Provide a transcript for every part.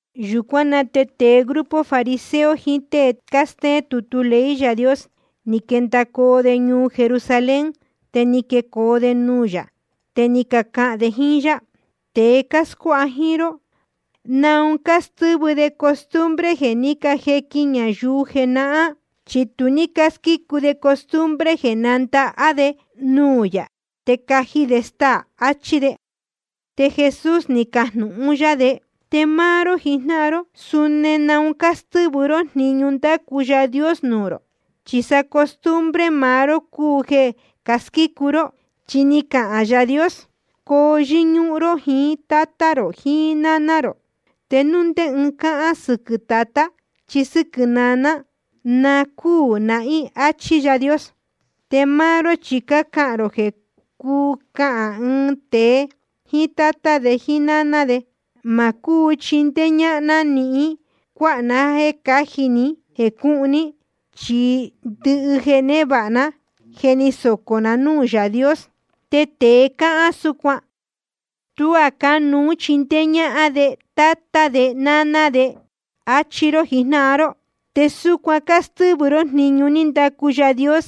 Yūcuán na te jecu tēe grupo fariseo jiín tée cástéén tutu ley Yaā Dios, ni quendacoo de ñuu Jerusalén, te ni quecoo de nuū yā. Te ni cacahān de jíín yá: Tēe cáscuáha jíín ró, ¿naun cástɨ́vɨ de costumbre jeē ní cajequin ñayuu jenahán? Chi tu ní cásquícu de costumbre jeē nándahá de nuū yā te caji de staā. Achí de. Te Jesús ni cajnūhun yá de: Te máá ró jijnáhan ró, ¿suni naun cástɨ́vɨ ró jniñu ní ndacu Yaā Dios nuū rō? Chi sa costumbre maá ró cúu jeē casquícu ró. Chi ni cahān Yaā Dios: Coo yɨ́ñúhún ró jiín tátá rō jiín náná rō. Te núu ndé ɨɨn cahān sɨquɨ̄ tatá chí sɨ́quɨ̄ naná, na cúū nahín, áchí Yaā Dios. Te máá ró chi cácahān rō jeē cuu cahān ɨɨn tēe jíín tátá de jíín náná de: Ma cúu chindéé ñáhán ná níhín cuáha na jéē cáji ni jéē cúhun ní, chi ndɨhɨ jeē névāha ná, je ni socō na núū Yaā Dios. Te tēe cahān súcuan, tuá cánuú chindéé ñáhán de tátá de náná de, áchí ró jijnáhan ró. Te súcuan cástɨ́vɨ ró jniñu ní ndacu Yaā Dios,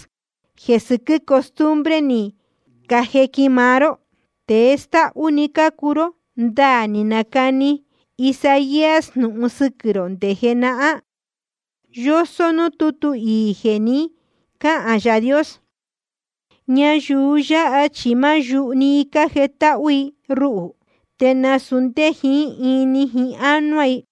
jeē sɨquɨ́ costumbre ni cajequin máá ró. Tēe stáhú‑ni cácuu ró. Ndaā ni nacani Isaías jnūhun sɨquɨ̄ rō nde jenahán, yósó núū tútu iī jeē ni cáhān Yaā Dios: Ñayuu yáha chi máá yuhu‑ni i cájetáhú i ruhū, te nasūu ndé jiín ini jiín ánuá i.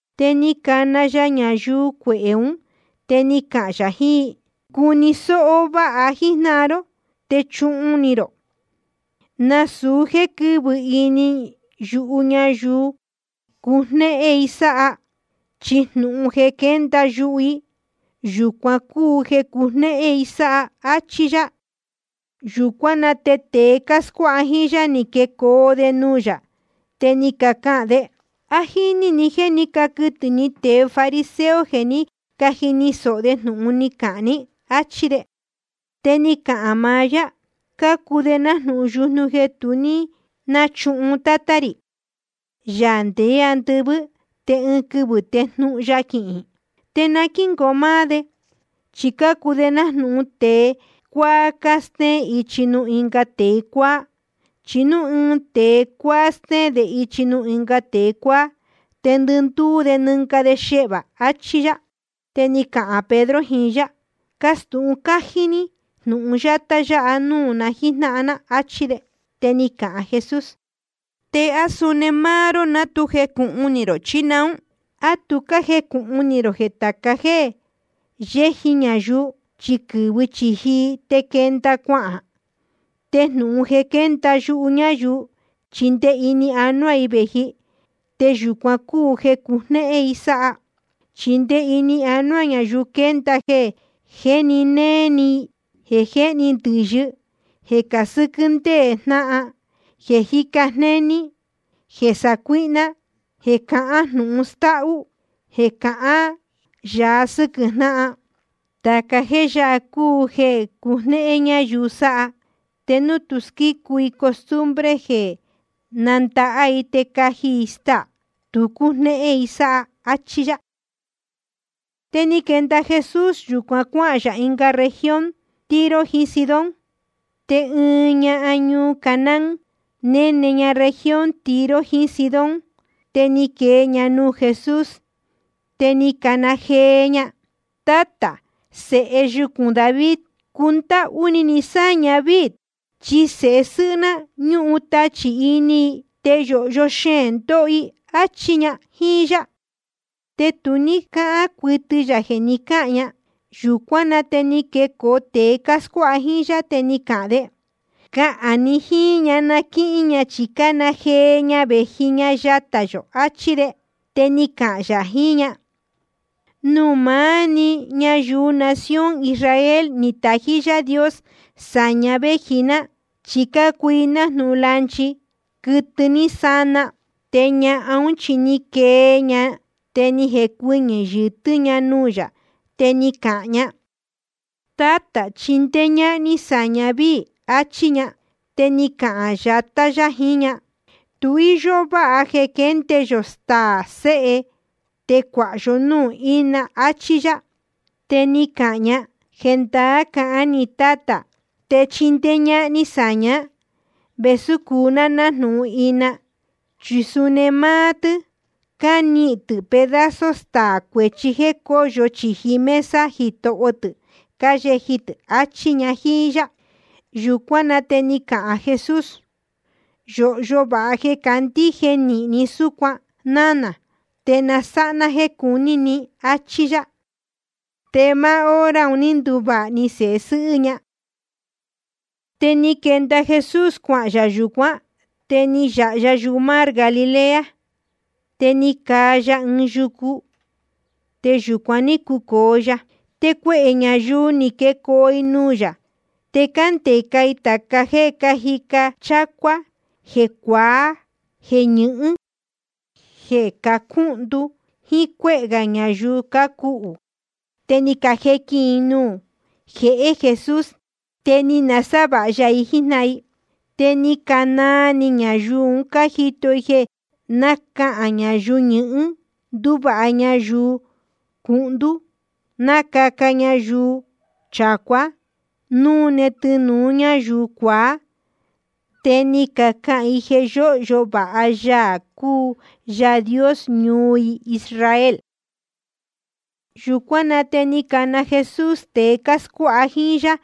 Te ni cana ya ñayuu cuehē ún, te ni cahān yā jiín i: Cuni sōho vāha jíjnáhan ró, te chuhun ni rō: Nasūu jéē quɨ́vɨ ini yuhu ñayuu cujnéhén i sáha. Chi jnūhun jeē quénda yuhu i, yūcuan cúu jeē cujnéhén i sáha, áchí yá. Yūcuán na te tēe cáscuáha jíín yá, ni quecoo de nuū yā, te ni cacahān de: ¿A jíní ni jéē ní caquɨtɨ̄ ni tēe fariseo jeē ní cajini sōho de jnūhun ni cahān ní? áchí de. Te ni cahān maá yá: Cácuu de nájnūhun yujnu jeē tu ní náchuhun Tátá rī, Yaā ndeé andɨvɨ́, te ɨɨn quɨvɨ̄ te jnuhun ya quihīn. Na quíngoo máá de. Chi cácuu de nájnūhun tēe cuáá cástéén ichi nuū ɨnga tēe cuáá. Chi núu ɨɨn tēe cuáá stéén de ichi nuū ɨnga tēe cuáá, te ndɨndúú de nɨnga de xehvā. Achí yá. Te ni cahān Pedro jiín yá: Castūhun cájí ní jnúhun yátá yáha nuū na jíjnáhan ná, áchí de. Te ni cahān Jesús: ¿Te á suni máá ró ná tu jecūhun ni rō chí naún? ¿A tu cájecūhun ni rō jeē tāca jéē yéji ñayuu, chi quɨ́vɨ chīji i, te quénda‑ni cuahān? Te jnūhun jeē quénda yuhu ñayuu, chi nde ini anuá i vēji, te yūcuan cúu jeē cujnéhén i sáha. Chi nde ini anuá ñayuu quénda jeē jéni néé ni, jeē jéhni ndɨ̄yɨ, jeē casɨ́quɨ́ ndéē jnáhan, jeē jíca jnéní, jeē sacuíhná, jeē cahán jnūhun stáhú, jeē cahán yāa sɨ́quɨ̄ jnáhan. Tāca jéē yáha cúu jeē cujnéhén ñayuu sáha. Te núu tu squícu i costumbre jeē nándahá i te caji i staā, tu cúnéhén i sáha. Achí yá. Te ni quenda Jesús yūcuan cuáhān yā región Tiro jiín Sidón. Te ɨɨn ñahan ñuu Canaán, néne ña región Tiro jiín Sidón, te ni quee ña nuū Jesús. Te ni cana jee ña: Tátā, Sēhe yucūn David, cundáhú ni ni sáña víī. Chi sēhe sɨ́hɨ́ ná, ñúhun tachī ini i, te yōhyo xeēn ndóho i, áchí ña jíín yá. Te tu ní cáhán cuɨtɨ yā jeē ni cáhān ña. Yūcuán na te ni quecoo tēe cáscuáha jíín yá, te ni cacahān de: Cahān ni jíín ña na quíhín ña, chi cána jee ña vēji ña yatā yō, achí de. Te ni cahān yā jiín ña: Nuū maá‑ni ñayuu nación Israel ni tají Yaā Dios sāña véji ná, chi cácuu i nájnūhun lanchi, quɨtɨ ní sana. Te ñahan ún chi ni quee ña, te ni jecuɨñɨ̄ yɨ̄tɨ́ ña nuū yā, te ni cahān ña: Tátā, chindéé ñáhán ní sáña víī, achí ña. Te ni cahān yatá yá jiín ña: Tu íyó váha jeē quénde yō staā sēhe, te cuāha yó núū ína, achí yá. Te ni cahān ña: Jendaá cahán ni Tátā, te chindéé ñáhán ní sáña vēsú cúu ná nájnūhun ina. Chi suni máá tɨ́ cánihīn nahín tɨ́ pedazo staā cuechí jéē cóyo chīji mesa jitoho tɨ̄ cáyeji tɨ̄, achí ña jíín yá. Yūcuán na te ni cahān Jesús: Yōhyo vāha jeē cándíje nīhin ní súcuan, nánā. Te na sáha ná jéē cuní ni, áchí yá. Te máá hora un ní nduvāha‑ni sēhe sɨ́hɨ́ ña. Te ni quenda Jesús cuahān yā yūcuán, te ni yāha ya yumar Galilea. Te ni caa ya ɨɨn yucu, te yūcuan ní cucōo ya. Te cuehē ñayuu ni quecoo i nuū yā, te cándeca i tāca jéē cájica chácuá, jeē cuaá, jeē ñɨhɨ́n, jeē cacúhndú, jíín cuéhē gā ñayuu cácuhū. Te ni cajequin i nuū jehé Jesús. Te ni nasávāha ya i jíjnáhan i. Te ni canaa ni ñayuu un cájito i jeē nácahān ñayuu ñɨhɨ́n, ndúvāha ñayuu cuhndú, nácaca vāha ñayuu chacuá, nánune tɨnūu ñáyuu cuaá. Te ni cacahān i jeē yóhyo vāha Yaā cúu Yaā Dios ñuu i Israel. Yūcuán na te ni cana Jesús tēe cáscuáha jíín yá,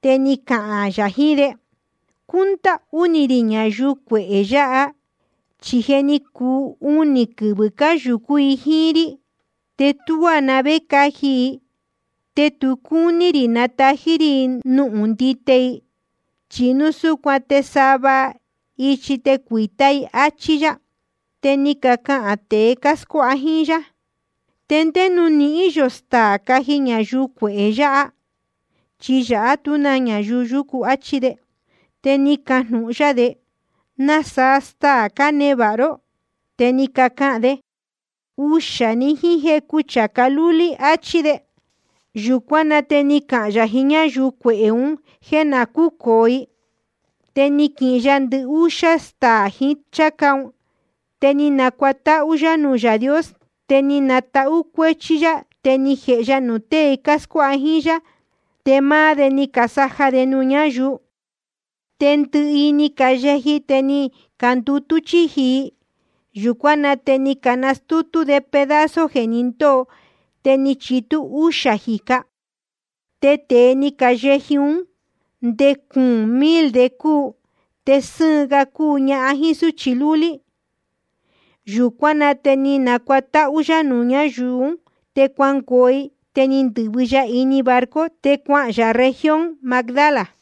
te ni cahān yā jiín de: Cúndáhú ni rī ñayuu cuehē yāhá, chi je ni cuu unī quɨvɨ̄ cáyūcú i jíín rí, te tuá na vé caji i. Te tu cúní rī natají rí i nuhun ndite i, chi núu súcuan te sava ichi te cuīta íī i. Achí yá. Te ni cacahān tēe cáscuáha jíín yá: ¿Te ndé nuū nihín yō staā caji ñayuu cuehē yāhá? Chi yāhá tú na ñayuu yúcu, achí de. Te ni cajnūhun yá de: ¿Nasaa staā cánevāha ró? Te ni cacahān de: Uxā‑ni, jíín jecu chācá lúlí, áchí de. Yūcuán na te ni cahān yā jiín ñáyuu cuehē un jéē na cúcōo i. Te ni quihin ya ndɨhúxá staā jiín cháca ún, te ni nacuatáhú yá nuū Yaā Dios. Te ni tahú cuéchí yá, te ni jēhe ya nuū tée cáscuáha jíín yá, te máá de ni casaja nuū ñáyuu. Te ndɨhɨ i ni cayeji, te ni candutú chíji i. Yūcuán na te ni canastútú de pedazo jeē ní quendōo, te ni chitú úxā jīca. Te tēe ni cayeji ún, nde cuūn mil de cúu, te sɨ́ɨn ga cúu ñahan jíín súchi lúlí. Yūcuán na te ni nacuatáhú yá nuū ñáyuu ún, te cuanungoo i. Te ni ndɨ̄vɨ ya ini barco, te cuahān yā región Magdala.